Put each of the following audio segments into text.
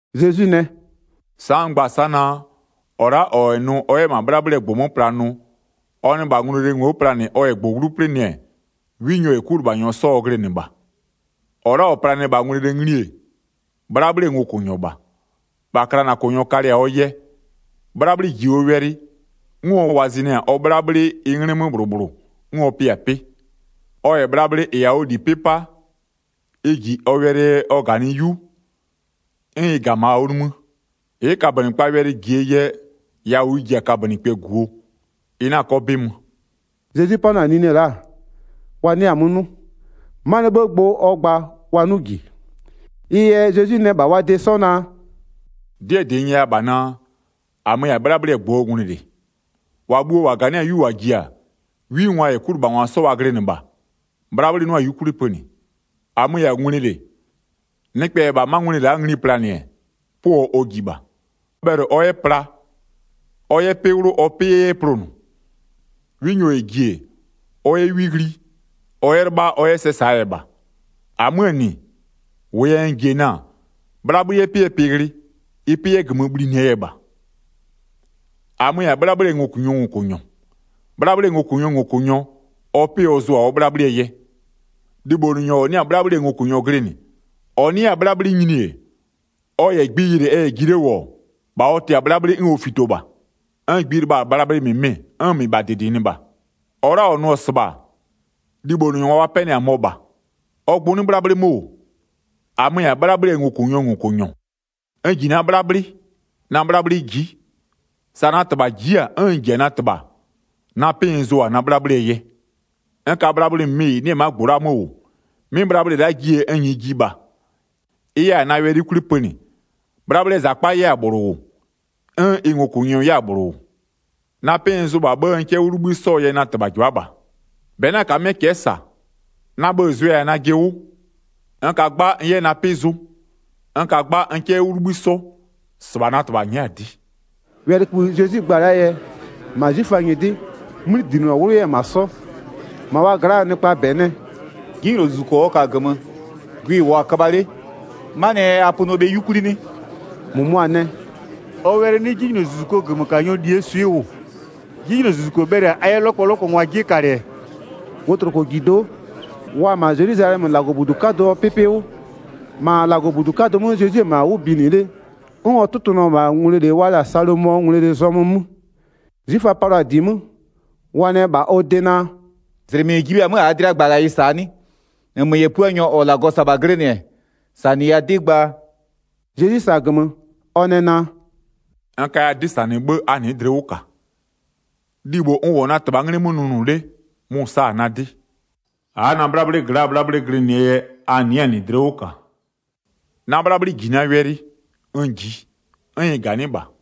Zezwi nɛ: “Sa'a n gba-a sa'a naa: -Ɔ la'a -ɔ -yɛ nʋ ɔ 'yɛ -ma 'bhlabhlɩɛ -gbʋ 'mö pla nʋ, ɔ nɩ -bha ngwlele ngli planɩ ɔ -yɛ -gbʋ 'wlu 'plɩnɩ-ɛ, 'winyɔ -yɛ 'kulɩbhanyɔ 'sɔ ɔ glɩnɩ -bha. 2-Ɔ la'a -ɔ planɩ-ɛ -bha ngwlele ngli-e, 'bhlabhlɩɛ ngokʋnyɔ -bha. 3-Bha klanakʋnyɔ kalɩ-a ɔ yɛ, 'bhlabhlɩ -ji ɔ wɛlɩ, 'n ɔ wɔzɩnɩ-a ɔ 'bhlabhlɩ ɩ 'nglɩ 'mö -bhlʋ -bhlʋ 'n ɔ pɩ-a 'pɩ. Ɔ -yɛ bhlabhlɩ -ɩ -yɛ-a ɔ -li 'pɩ 'pa, ɩ -ji ɔ wɛlɩɛ yɛ ɔ -ganɩɩ 'yu, 'n ɩ -ga-a -ma ɔ nimï. Ɩ'ɩ kabönɩkpaa wɛlɩ -jie yɛ, yawʋ ɩ ji-a kabönɩkpɛ -guo, ɩ 'na 'kɔ 'bɩ mö.” Zezwi 'panʋa-a nine la'a, wa 'nɩa-a 'mö 'nʋ, 'manɩɛ 'bhëë gbʋ ɔ gba wa 'nʋ -ji. Ɩ yɛ Zezwi nɛ -bha wa de 'sɔ naa: “'Dɩɛ -dɩ n nyɛya -bha naa: -Amö-ö -yɛ-a 'bhlabhlɩɛ -gbʋɔ ngwlele. 8-Wa bhuo-o -ganɩ'ɩ-a 'yu -wa ji-a, 'wingwa -yɛ 'kulɩbhangwa 'sɔ wa glɩnɩ -bha, 'bhlabhlɩ 'nʋa-a 'yukwli pönɩ. 9-Amö-ö -yɛ-a ngwlele, nɩkpɛ -yɛ -bha 'ma ngwlele la'a ngli planɩ-ɛ, 'pʋɔ ɔ ji -bha. Ɔ bhɛlɩ ɔ 'yɛ pla, ɔ 'yɛ 'pɩ 'wlʋ ɔ 'pɩ 'yɛ 'yɛ plonʋ. 'Winyɔ -yɛ -nɩ ji-e, ɔ 'yɛ 'wi ghli, ɔ 'yɛ 'lɩbha ɔ 'yɛ sɛ -saa yɛ -bha. -Amöö -nɩ, -wʋʋ yɛ n ji-e na-a, 'bhlabhlɩ 'yɛ 'pɩɛ pɩ ghlɩ ɩ 'pɩ 'yɛ -gömö bhlinɩɛ yɛ -bha. 11-Amö-ö -yɛ-a 'bhlabhlɩɛ ngokʋnyɔɔ -ngokʋnyɔ. 'Bhlabhlɩɛ ngokʋnyɔɔ -ngokʋnyɔ, ɔ 'pɩ ɔ zʋ-a ɔ 'bhlabhlɩɛ yɛ. Libhonʋnyɔ -ɔ 'nɩ-a 'bhlabhlɩɛ ngokʋnyɔ glɩnɩ, -ɔ 'nɩ 'yɛ-a 'bhlabhlɩ nyini-e, ɔ -yɛ gbi yɩlɩ ɛ -yɛ ji 'le -wʋ-ɔ, -bha ɔ tɩ-a 'bhlabhlɩ 'n ɔ fito -bha. 'N gbi lɩbha-a bhlabhlɩ -mɩmɩ 'n -mɩbha -dɩdɩnɩ -bha. 13-Ɔ la'a -ɔ nʋ-ɔ -sɩbha, libhonʋnyɔ -ɔ wa 'pɛnɩ-a mɔ-ɔ -bha, ɔ gbʋ 'nɩ 'bhlabhlɩ 'mö -wʋ. 14-Amö-ö -yɛ-a 'bhlabhlɩɛ ngokʋnyɔɔ -ngokʋnyɔ, n -ji na 'bhlabhlɩ, na 'bhlabhlɩ ji'i, sa na -Tɩbha ji'i-a, 'n n -ji-a na -Tɩbha. Na 'pɩ n zʋ-a na 'bhlabhlɩɛ yɛ. N ka bhlabhlɩ -mɩmɩ -ɩ 'nɩ-ɛ ma'a -gbʋ la'aa 'mö -wʋ. 'Mɩ bhlabhlɩ la'a jie n -nyɩɩ ji -bha, ɩ 'yɛ-a na wɛlɩ 'yukwli pönɩ, 'bhlabhlɩɛ -zakpa 'yɛ-a -bhlʋ -wʋ, 'n ɩ ngokʋnyɔ 'yɛ-a -bhlʋ -wʋ. Na 'pɩ n zʋ -bha 'bhë, n 'kɛ 'wʋ 'libhï 'sɔɔ yɛ na -Tɩbha -jɩbha'a -bha. 18-Bɛ 'na -kamɩ'ɩɛ cɛ'ɛ -sa, na bhë-ë zʋɛ-a najɩ 'wʋ. N ka 'gba n 'yɛ na 'pɩ zʋ, n ka 'gba n 'kɛ 'yɛ 'wʋ 'libhï 'sɔ. -Sɩbha na -Tɩbha nyɛ'ɛ-a 'dɩ.” Wɛlɩkïbhï Zezwi gba-a la'aa yɛ, -ma 'zwiföa nyɩdɩ 'mödlinɔ 'wlʋ 'yɛ-ɛ -ma 'sɔ. 20-Ma wa gla'aa nɩkpaa -bɛ nɛ: “'Jinylozuzuko ɔ ka-a -gömö, gwɩ-ɩ -wʋɔ-a köbha 'le, 'manɩɛ yɛ a pönɩɔ bhe 'yukwli 'nɩ?” 21-Mʋmʋa nɛ: “Ɔ wɛlɩ 'nɩ 'jinylozuzukoo -gömökanyɔɔ -lie swɩ -wʋ. 'Jinylozuzuko bhɛlɩ-a a 'yɛ 'lɔkpɔlɔkpɔngwaa 'jie kalɩ-ɛ?” Wotlokojido'o, wa-a -ma Zelwizalɛmö -Lagɔbudu 'kadʋɔ 'pɩpɩ 'wʋ, 23-ma -Lagɔbudu 'kadʋ 'mö Zezwi-e -ma 'wʋ binɩ 'le, 'n ɔ tʋtʋnʋ-ɔ -bha ngwlele wa la-a Salomɔɔ ngwlele zɔmö 'mö. 'Zwiföa palɩɔ-a -di 'mö, wa nɛ -bha ɔ de naa: “-Zlɩmɩ -n ji bhe-a 'mö -aa dlɩa -gbaghayɩ -saa 'nɩ? -Nmö -yɛ Puanyɔ -ɔ -Lagɔ -sa-a -bha glɩnɩ-ɛ, -sanɩya 'dɩ gbaa.” Zezwi -sa-a -gömö, ɔ nɛ naa: “N kaya 'dɩ -sanɩ 'bhë a 'nɩɩ dlɩ 'wʋ -ka, libho n -wʋ-ɔ na -Tɩbhaa 'nglɩ 'mö nʋnʋ 'le, mʋ-ʋ sa-a na 'dɩ. A'a na 'bhlabhlɩ gla'aa 'bhlabhlɩ glɩnɩɛ yɛ a 'nɩɩ-a -nɩ dlɩ 'wʋ -ka. Na 'bhlabhlɩ -ji na wɛlɩ, n -jiɩ, 'n ɩ -ganɩ'ɩ -bha.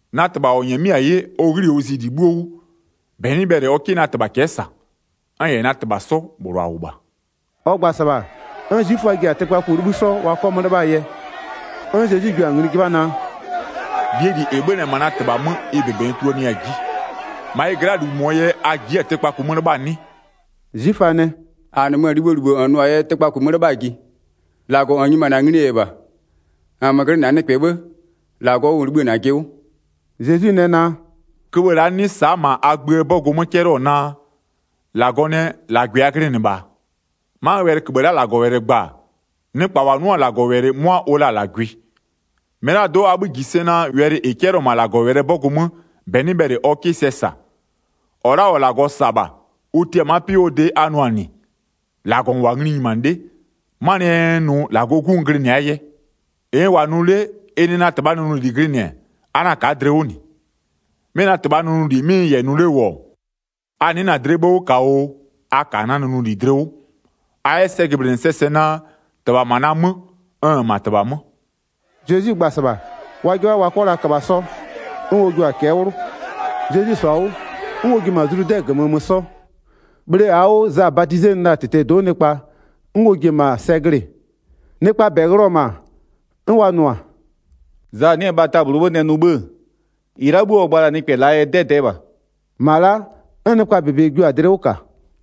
Na -Tɩbha -ɔ -nyɛmɩ'ɩ-a 'ye, ɔ 'ghli-i ɔ zi -li 'bhuo 'wʋ, -bɛ 'nɩ bhɛlɩ ɔ 'kɩ na -Tɩbha cɛ'ɛ -sa. N -yɛ -Tɩbha 'sɔ -bhlʋ -a -wʋ -bha.” Ɔ gba-a -sɩbha, 'n 'zwiföa ji-a tɩkpaku 'libhï 'sɔ wa 'kɔ 'mö 'lɩbhaa yɛ. 'N Zezwi jua-a ngli 'jɩbha naa: “-Lie -li -ɩ 'bhönɩ-ɛ -ma -Tɩbha 'mö, ɩ -bebe n tuluanɩya-a 'ji, -ma ɩ gla'aa -lu -mʋɔ yɛ a ji'i-a tɩkpaku 'mö 'lɩbhaa 'nɩ?” 'Zwiföa nɛ: “-A -nɩmö-ö libhoo -libho -n nʋ-aa yɛ tɩkpaku 'mö 'lɩbhaa ji, -Lagɔ -n nyimanɩ-a nglie yɛ -bha. -Nmö glɩnɩ-a nɩkpɛ 'bhë, -Lagɔ wʋ -n libhï-ë -najɩ 'wʋ.” Zezwi nɛ naa: “Köbhë la'a 'nɩ sa'a -ma a gböö 'bɔgʋ 'mö 'cɛlɩɔ-ɔ naa: -Lagɔ nɛ: -Lagwɩ a glɩnɩ -bha-a? 'Ma wɛlɩköbhë la'a -Lagɔ gba-a, nɩkpa -wa 'nʋ-a -Lagɔwɛlɩ 'mʋa ʋ la-a -lagwɩ. -Mɩlado'o a 'bhï -ji sɛ naa wɛlɩ -ɩ 'cɛlɩɔ-ɔ -ma -Lagɔwɛlɩɛ 'bɔgʋ 'mö -bɛ 'nɩ bhɛlɩ ɔ 'kɩ sɛ -sa. 36-Ɔ la'a -ɔ -Lagɔ -sa-a -bha, ʋ tia-a ma'a 'pɩ 'wʋɔ de a nʋ-a -nɩ: -Lagɔ -n -wʋ-a ngli nyimanɩ 'le, 'manɩɛ yɛ n nʋ -Lagɔɔ 'Gu n glɩnɩ-aa yɛ. 37-Ɩ n -wʋ-a nʋ 'le, ɩ nɩ na -Tɩbhaa nʋnʋli glɩnɩ-ɛ, a 'na ka'a dlɩ 'wʋ -nɩ. 'Mɩ na -Tɩbhaa nʋnʋli 'mɩ n -yɛ nʋ 'le -wʋ-ɔ, a nɩ'ɩ na-a dlɩɛ 'bhë 'wʋ -ka oo, a -ka na nʋnʋli dlɩ 'wʋ. A 'yɛ sɛ jɩblɩnɩ -sɛɛ sɛ naa, -Tɩbha-a -ma na 'mö, n-n -ma -Tɩbha 'mö.” Zezwi gba-a -sɩbha, wa 'jɩbha wa 'kɔ la köbha 'sɔ, 'n ɔ jua-a cɛ'ɛ 'wlʋ. Zezwi -sɔ-a 'wʋ, 'n ɔ ji-e -ma Zludɛ -gömö mö 'sɔ, bhle -aa 'wʋ Za badizenɩ la-a -tɩtɛɛ do'o nɩkpa, 'n ɔ ji-e -ma sɛ glɩ-ɩ. Nɩkpaa -bɛ ghlɩɔ-ɔ -ma, 'n wa nʋ-a: “Za 'nɩ-ɛ bhata -bhlʋɔ 'bhë nɛ nʋ 'bhë-ë, -ɩ la'a 'bhuo ɔ gba la-a nɩkpɛ la'aa yɛ 'dɛdɛɛ -bha.” 42-Ma la'a, 'n nɩkpaa -bebe jio-a dlɩ 'wʋ -ka.